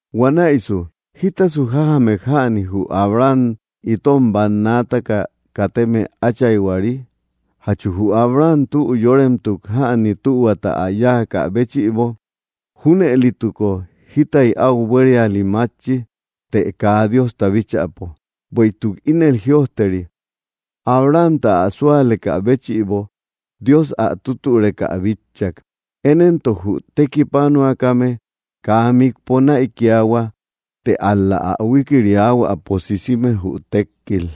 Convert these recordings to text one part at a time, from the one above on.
Huanäisu, ¿jítasu jájamek jäni, jü Abraham itom bannaataka kateme áchayhuari? ¿Jachu jü Abraham tü yóremetuk jäni, tühuata ä yáakä béchïbo? Júnëlituko jitay áu buériali mátchi, të kaa Diosta bíchäpo. Bueïtuk ínel jïojteri: “Abrahamta, ä súalekä béchïbo, Dios ä tutüreka ä bitchak.” Én éntok jü tekipanuakame kaa mikpo nanäikiahua, të ál‑la ä huikiriahuäpo sisime, jü tékkil.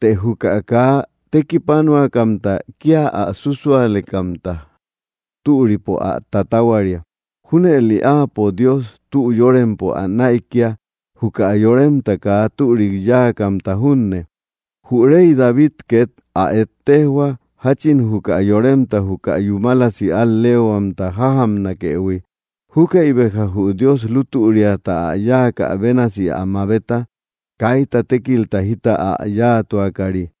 Të juka kaa tekipanuakamta, kía ä súsualekamta türipo ä tatahuaria. Júnëli Áapo Dios tü yórempo ä näikia, juka yoremta kaa türik yáakamta junne. Jü rey David két ä ettejoa, jáchin juka yoremta juka yúmalasi al‑leehuamta jájamnakëhui. Júkäi béja jü Dios lútüriata ä yáakä bénasi ä mabeta, kaita tékilta jita ä yáatuakari.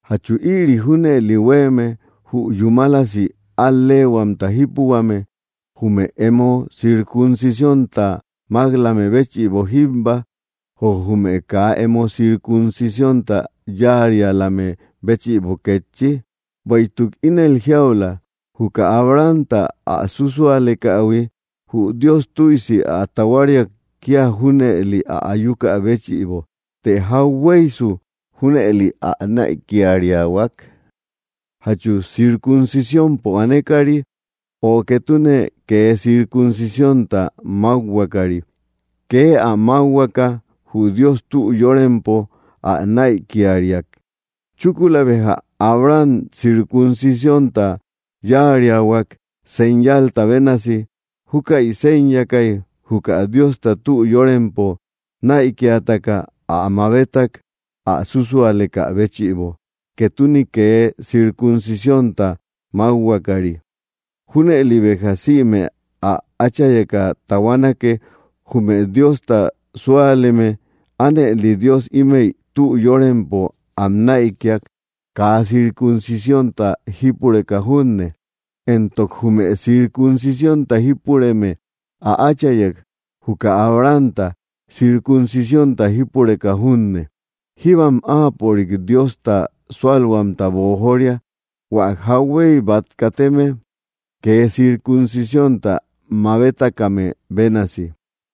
¿Jachu ïri junëli huéeme, jü yúmalasi al‑leehuamta jípuhuame jume emo circuncisiónta mák‑lame béchïbo jíbba, ö jume kaa emo circuncisiónta yáarialame béchïbo kétchi? Bueïtuk ínel jiaula, juka Abrahamta ä súsualekähui, jü Dios tüisi ä tahuariak kía junëli ä ayukä béchïbo. Të, ¿jauhueysu junëli ä näikiriahuak? ¿Jachu circuncisiónpo anekari, ö ketune kee circuncisiónta mákhuakari? Kee ä mákhuaka jü Dios tü yórempo ä näikiriak. Chúkula béja Abraham circuncisiónta yáariahuak, señalta bénasi. Júkäi séñakay, juka Diosta tü yórempo näikiataka ä mabetak, ä súsualekä béchïbo, ketune kee circuncisiónta mákhuakari. Júnëli béja sïme ä áchayeka tahuanake, jume Diosta súaleme. Ánëli Dios ímëi tü yóremempo am näikia, kaa circuncisiónta jípureka junne. Entok jume circuncisiónta jípureme ä áchayek, juka Abrahamta, circuncisiónta jípureka junne. Jíbam áapörik Diosta súalhuamta boojoria, hua jauhuey bát kateme kee circuncisiónta mabetakame bénasi.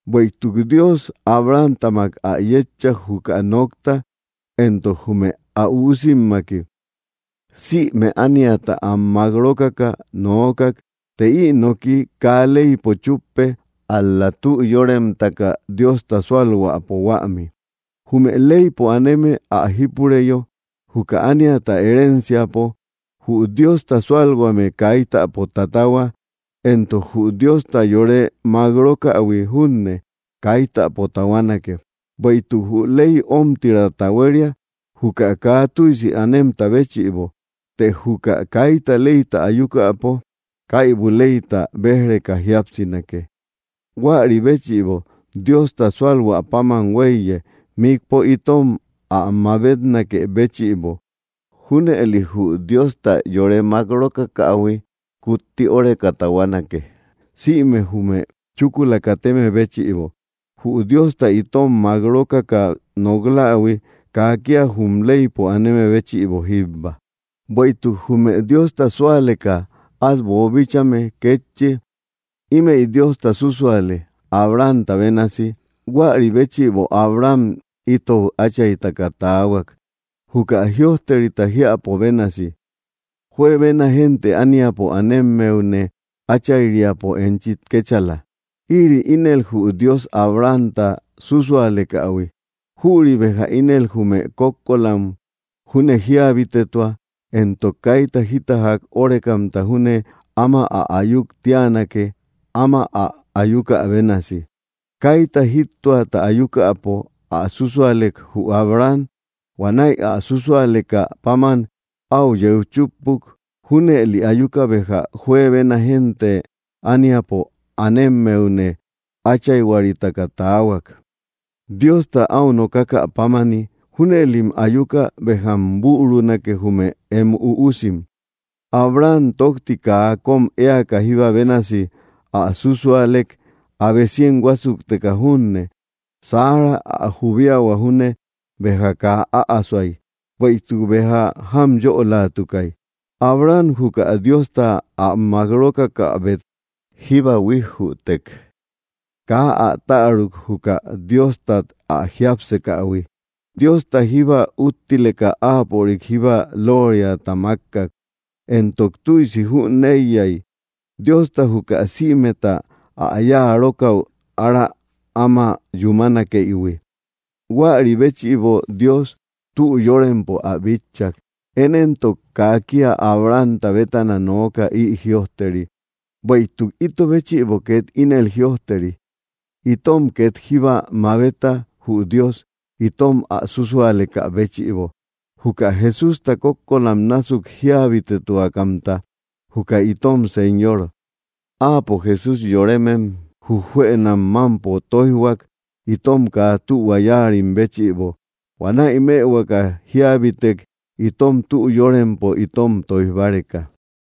Bueïtuk Dios Abrahamtamak ä yétchak, juka nokta, entok jume ä üusimmaki. Sïme ániata am mák rókaka nookak. Të ï noki kaa leypo chúppe, ál‑la tü yóremtaka Diosta súalhuäpo huämi. Jume leypo aneme ä jípureyo, juka ániata herenciapo, jü Diosta súalhuame kaitapo tatahua, entok jü Diosta yore mák rókähui junne, kaitapo tahuanake. Bueïtuk jü ley ómtirata huéria, juka kaa tüisi anemta béchïbo; të juka kaita leyta ayukäpo, kaibu leyta béj‑reka jíapsinake. Huäri béchïbo, Diosta sualhuä páman huéiye, mikpo itom ä mabetnakë béchïbo. Júnëli jü Diosta yore mák rókakähui kutti óreka tahuanake, sïme jume chúkula kateme béchïbo. Jü Diosta itom mák rókaka nok‑lähui kaa kía jum leypo aneme béchïbo jíbba, bueïtuk jume Diosta súaleka át boobíchaïhuime kétchi. Ímëi Diosta súsuale, Abrahamta bénasi; huäri béchïbo Abraham ítou áchaytaka taahuak, juka jïojterita jiäpo bénasi: “Juebena génte ániapo anemmeune áchayriapo enchi kéchala.” Ïri ínel jü Dios Abrahamta súsualekähui; jüri béja ínel jume kókkolam júne jíabitetua, entok kaita jita ják órekamta júne áma ä ayuk tíanake, áma ä ayuka bénasi. Kaita jíttoata ayukäpo ä súsualek, jü Abraham. Huanäi ä súsualekä páman áu yeu chúppuk; junëli ayuka béja juebena génte ániapo anemmeune áchayhuaritaka taahuak, Diosta áu nokakä pámani: “Júnëlim ayuka béjam bürunake, jume em üusim.” Abraham tókti kaa kóm éaka, jíba bénasi ä súsualek, abe cien huásukteka junne. Sara ä jubiahua junne béja kaa äasoay, bueïtuk béja jámyölatukay. Abraham juka Diosta ä mák rókakäbet jíba huijjütek; kaa ä täruk, juka Diostat ä jiápsekähui. Diosta jíba úttileka áapörik jíba lóoriata mákkak, entok tüisi jüneiyay, Diosta juka sïmeta ä yáa rókäu ára áma yúmanakeïhui. Huäri béchïbo Dios tü yórempo ä bitchak. Én éntok kaa kía Abrahamta bétana nooka, ï jïojteri; bueïtuk ito béchïbo két ínel jïojteri. Itom két jíba mabeta, jü Dios, itom ä súsualekä béchïbo, juka Jesústa kókkolam násuk jíabitetuakamta, juka itom Señor, Áapo Jesús yoremem jujjuënam mámpo tóijhuak, itom kaa tühua yáarim béchïbo. Huanäi mëhuakä jíabitek, itom tü yórempo tóij báreka.